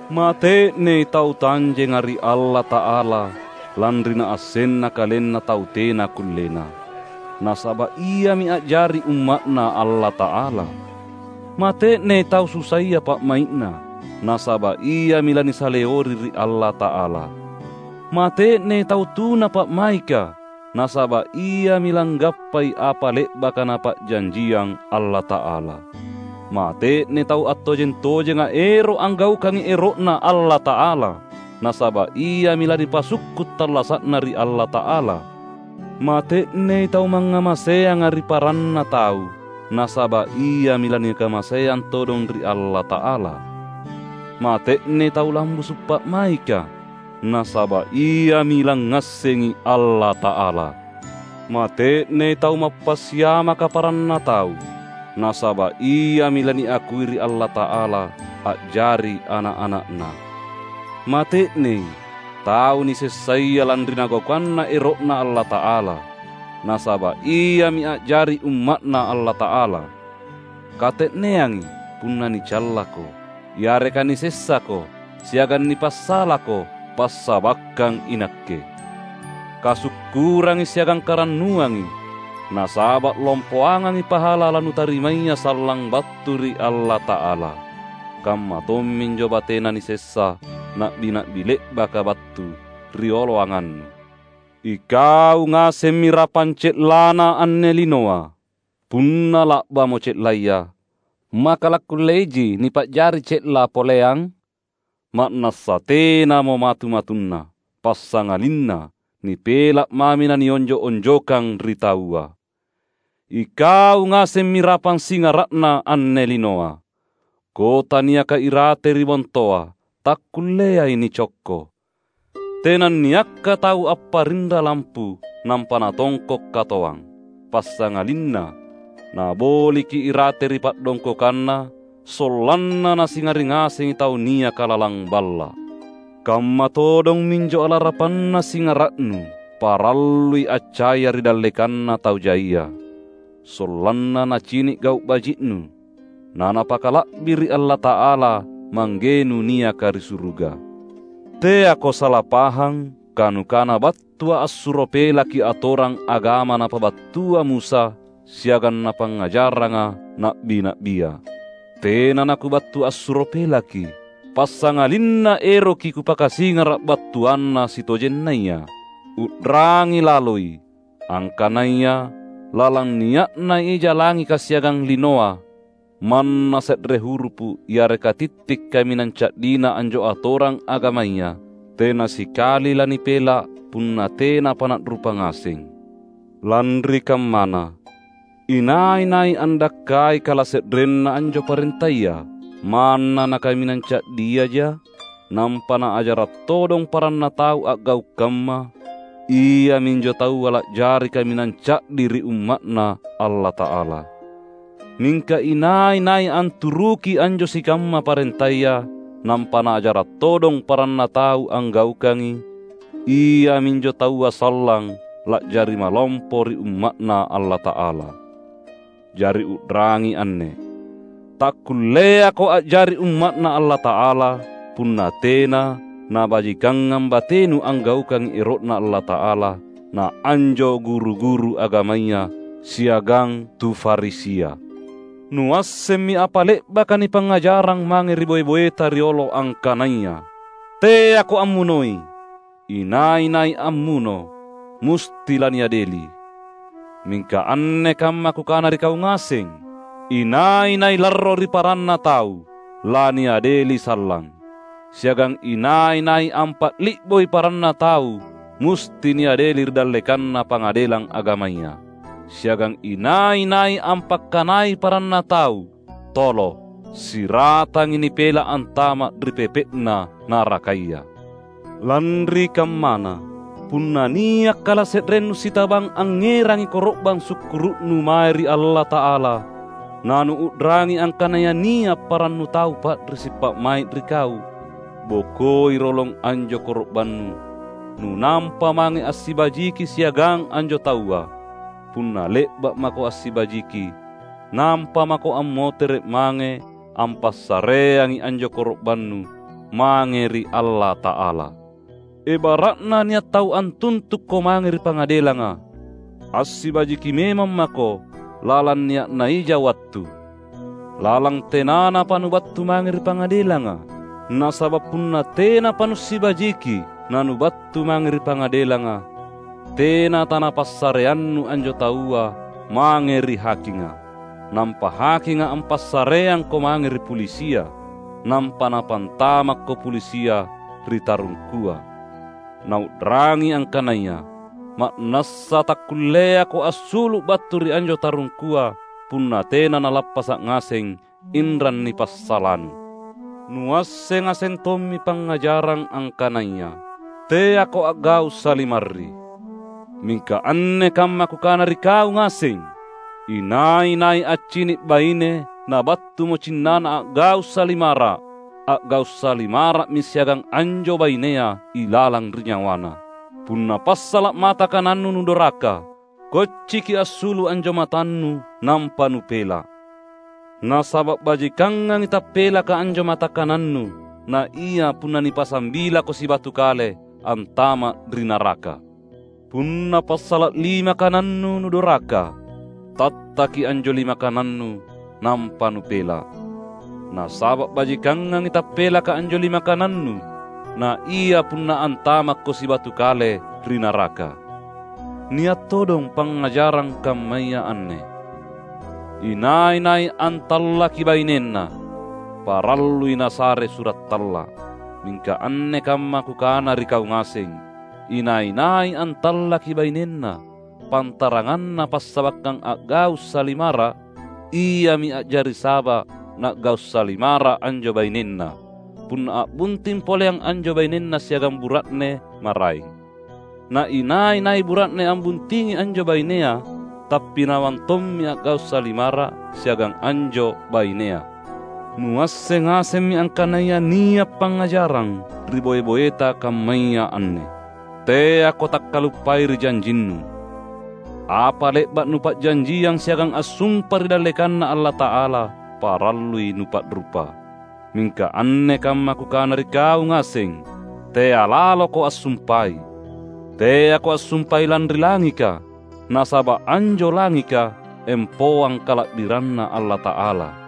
"Mate’nei tau tanjenga ri Allata’ala lanri naassenna kalenna tau tena kullena; nasaba’ iami a’jari umma’Na Allata’ala! Mate’nei tau susaya pa’mai’na; nasaba’ iami lanisaleori ri Allata’ala! Mate’nei tau tuna pa’maika; nasaba’ iami langgappai apa le’baka Napa’janjiang Allata’ala! Mate’nei tau attojeng-tojenga ero’ anggaukangi ero’Na Allata’ala; nasaba’ iami lanipasukku’ tallasa’na ri Allata’ala! Mate’nei tau mangngamaseanga ri paranna tau; nasaba’ iami lanikamaseang todong ri Allata’ala! Mate’nei tau lambusu’ pa’maika; nasaba’ iami langngassengi Allata’ala! Mate’nei tau mappasiamaka paranna tau; nasaba’ iami laniakui ri Allata’ala a’jari ana’-ana’Na! Mate’nei tau nisessaya lanri nagaukanna ero’Na Allata’ala; nasaba’ iami a’jari umma’Na Allata’ala! Kate’neangi punna nicallako, yareka nisessako siagang nipassalako passabakkang iNakke. Kasukkurangi siagang karannuangi, nasaba’ lompoangangi pahala lanutarimaya sallang battu ri Allata’ala. Kamma tomminjo batena nisessa na’bi-na’bi le’baka battu rioloangannu." "Ikau ngasemmi rapang ce’lana anne linoa. Punna la’bamo ce’laya, maka lakkulleiji nipa’jari ce’la poleang? Ma’nassa tenamo matu-matunna, passangalinna nipela’ mami na nionjo’-onjokang ri taua. Ikau ngasemmi rapang singara’na anne linoa. Kota niaka irate ri bontoa takkulleai nicokko. Tenanniakka tau apparinra lampu nampa natongko’ katoang. Passangalinna naboliki irate ri pa’dongkokanna, sollanna nasingari ngasengi tau niaka lalang balla’. Kamma todong minjo alarapanna singara’nu, parallui accaya ri dallekanna tau jaia; sollanna nacini’ gau’ baji’nu, na napakala’biri’ Allata’ala Manggenu niaka ri suruga." "Teako sala pahang kanukana battuA’ assuro pelaki atorang agama napabattua Musa siagang napangngajarranga na’bi-na’bia. Tena naKubattu assuro pelaki, passangalinna eroki Kupakasingara’ battuanna sitojennaya. U’rangi laloi! Angkanaya lalang nia’na ija langika siagang linoa, manna se’re hurupu’ yareka titti’ kaminang ca’dina anjo atorang agamaya tena sikali lanipela’ punna tenapa na’rupa ngaseng! Lanri kammana, inai-nai andakkai kalase’renna anjo parentaya, manna nakaminang ca’diaja, nampa naajara’ todong paranna tau a’gau’ kamma, iaminjo taua la’jari kaminang ca’di ri umma’Na Allata’ala. Mingka inai-nai anturuki anjo sikamma parentaya, nampa naajara’ todong paranna tau anggaukangi, iaminjo taua sallang la’jari malompo ri umma’Na Allata’ala. Jari u’rangi anne: Takkulleako a’jari umma’Na Allata’ala, punna tena nabajikangang batenu anggaukangi ero’Na Allata’ala naanjo guru-guru agamaya siagang tu Farisia!" "Nuassemmi apa le’baka nipangngajarrang mange ri boe-boeta riolo angkanaya: Teako ammunoi; inai-nai ammuno, musti laniadeli. Mingka anne kamma Kukana ri kau ngaseng, inai-nai larro ri paranna tau, laniadeli sallang; siagang inai-nai ampali’boi paranna tau musti niadeli ri dallekanna Pangadelang Agamaya. Siagang inai-nai ampakkanai paranna tau, ‘Tolo,’ siratangi nipela’ antama’ ri pepe’na narakaya. Lanri kammana, punna nia’ kalase’rennu sitabang angngerangi koro’bang sukkuru’nu mae ri Allata’ala, na nuu’rangi angkanaya nia’ parannu tau pa’risi’ pa’mai’ ri kau, bokoi rolong anjo koro’bannu, nunampa mange assibajiki siagang anjo taua. Punna le’ba’ mako assibajiki, nampa mako ammotere’ mange ampassareangi anjo koro’bannu mae ri Allata’ala. Ebara’na nia’ tau antuntukko mange ri pangadelanga, assibajiki memang mako lalang nia’na ija wattu, lalang tenanapa nubattu mange ri pangadelanga. Nasaba’ punna tenapa nussibajiki nanubattu mange ri pangadelanga, tena tanapassareannu anjo taua mange ri hakinga; nampa hakinga ampassareangko mange ri pulisia; nampa napantamakko pulisia ri tarungkua; Na u’rangi angkanaya: Ma’nassa takkulleako assulu’ battu ri anjo tarungkua punna tena nalappasa’ ngaseng inrang nipassalanu." "Nuasseng ngaseng tommi pangngajarang angkanaya: Teako a’gau’ salimarri. Mingka anne kamma Kukana ri kau ngaseng: Inai-nai accini’ baine nabattumo cinnana a’gau’ salimara’, a’gau’ salimara’mi siagang anjo bainea ilalang ri nyawana. Punna passala’ mata kanannu nudoraka, kocciki assulu’ anjo matannu nampa nupela’! Nasaba’ bajikangangi tappelaka anjo mata kanannu, naia punna nipasambilako sibatu kale antama’ ri naraka. Punna passala’ lima kanannu nudoraka, tattaki anjo lima kanannu nampa nupela’! Nasaba’ bajikangangi tappelaka anjo lima kanannu, naia punna antamakko sibatu kale ri naraka." "Nia’ todong pangngajarang kammaya anne: Inai-nai antallaki bainenna, parallui nasare sura’ talla’. Mingka anne kamma Kukana ri kau ngaseng: inai-nai antallaki bainenna pantaranganna passabakkang a’gau’ salimara’, iami a’jari saba’ na’gau’ salimara’ anjo bainenna, punna a’bunting poleang anjo bainenna siagang bura’ne maraeng. Na inai-nai bura’ne ambuntingi anjo bainea, tappinawang tommi a’gau’ salimara’ siagang anjo bainea." "Nuasseng ngasemmi angkanaya nia’ pangngajarang ri boe-boeta kammaya anne: teako takkaluppai ri janjinnu. Apa le’ba’ nupa’janjiang siagang assumpa ri dallekanNa Allata’ala, parallui nupa’rupa. Mingka anne kamma Kukana ri kau ngaseng: tea’ laloko assumpai. Teako assumpai lanri langika, nasaba’ anjo langika empoang kala’biranNa Allata’ala;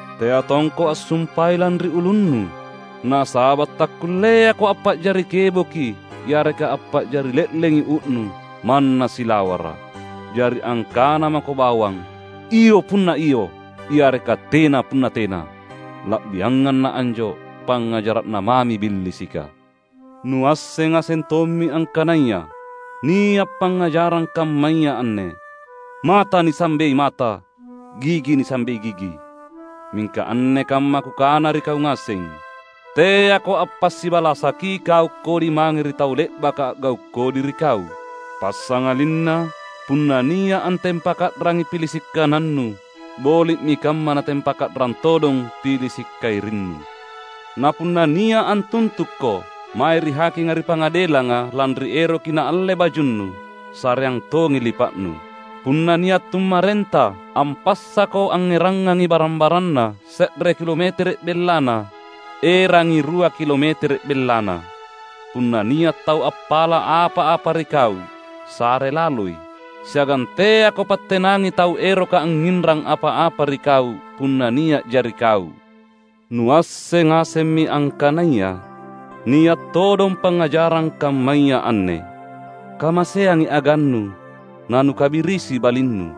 Tea tongko assumpai lanri ulunnu, nasaba’ takkulleako ampa’jari keboki yareka ampa’jari le’lengi uu’nu manna silawara’. Jari angkana mako bawang ‘Iyo’ punna iyo, yareka ‘Tena’ punna tena. La’biangang na anjo, pangngajara’na mami billisika." "Nuasseng ngaseng tommi angkanaya nia’ pangngajarang kammaya anne: mata nisambei mata; gigi nisambei gigi. Mingka anne kamma Kukana ri kau ngaseng: teako appasibalasaki gau’ kodi mange ri tau le’baka a’gau’ kodi ri kau. Passangalinna punna nia’ antempaka’rangi pilisi’ kanannu, boli’mi kamma natempaka’rang todong pilisi’ kairinnu. Na punna nia’ antuntukko mae ri hakinga ri pangadelanga lanri eroki naalle bajunnu, sareang tongi lipa’nu. Punna nia’ tummarenta ampassako angngerangangi barang-baranna se’re kilometere’ bellana, erangangi rua kilometere’ bellana. Punna nia’ tau appala’ apa-apa ri kau, sare laloi. Siagang teako pattenangi tau eroka angnginrang apa-apa ri kau punna nia’ja ri kau." "Nuasseng ngasemmi angkanaya nia’ todong pangngajarang kammaya anne: kamaseangi agannu na nukabirisi balinnu.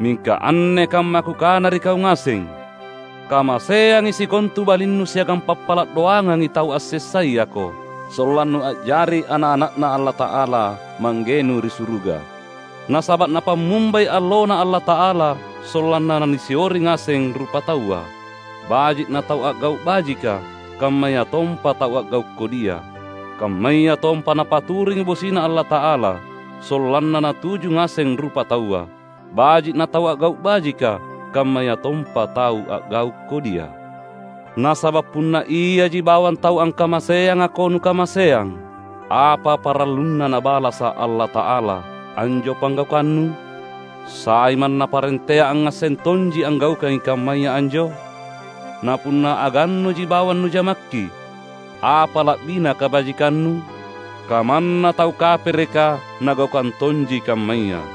Mingka anne kamma Kukana ri kau ngaseng: kamaseangi sikontu balinnu siagang pappala’ doangangi tau assessayako, sollannu a’jari ana’-ana’Na Allata’ala Manggenu ri suruga. Nasaba’ Napammumbai alloNa Allata’ala sollanna nasiori ngaseng rupataua, baji’ natau a’gau’ bajika kammayatompa tau a’gau’ kodia. Kammayatompa Napaturungi bosiNa Allata’ala sollanna natuju ngaseng rupataua, baji’ natau a’gau’ bajika kammayatompa tau a’gau’ kodia. Nasaba’ punna iaji bawang tau angkamaseangako nukamaseang, apa paralluna Nabalasa’ Allata’ala anjo panggaukannu? Sai manna parentea angngasseng tonji anggaukangi kammaya anjo? Na punna agannuji bawang nujamakki, apa la’bina kabajikannu? Kamanna tau kapereka nagaukang tonji kammaya.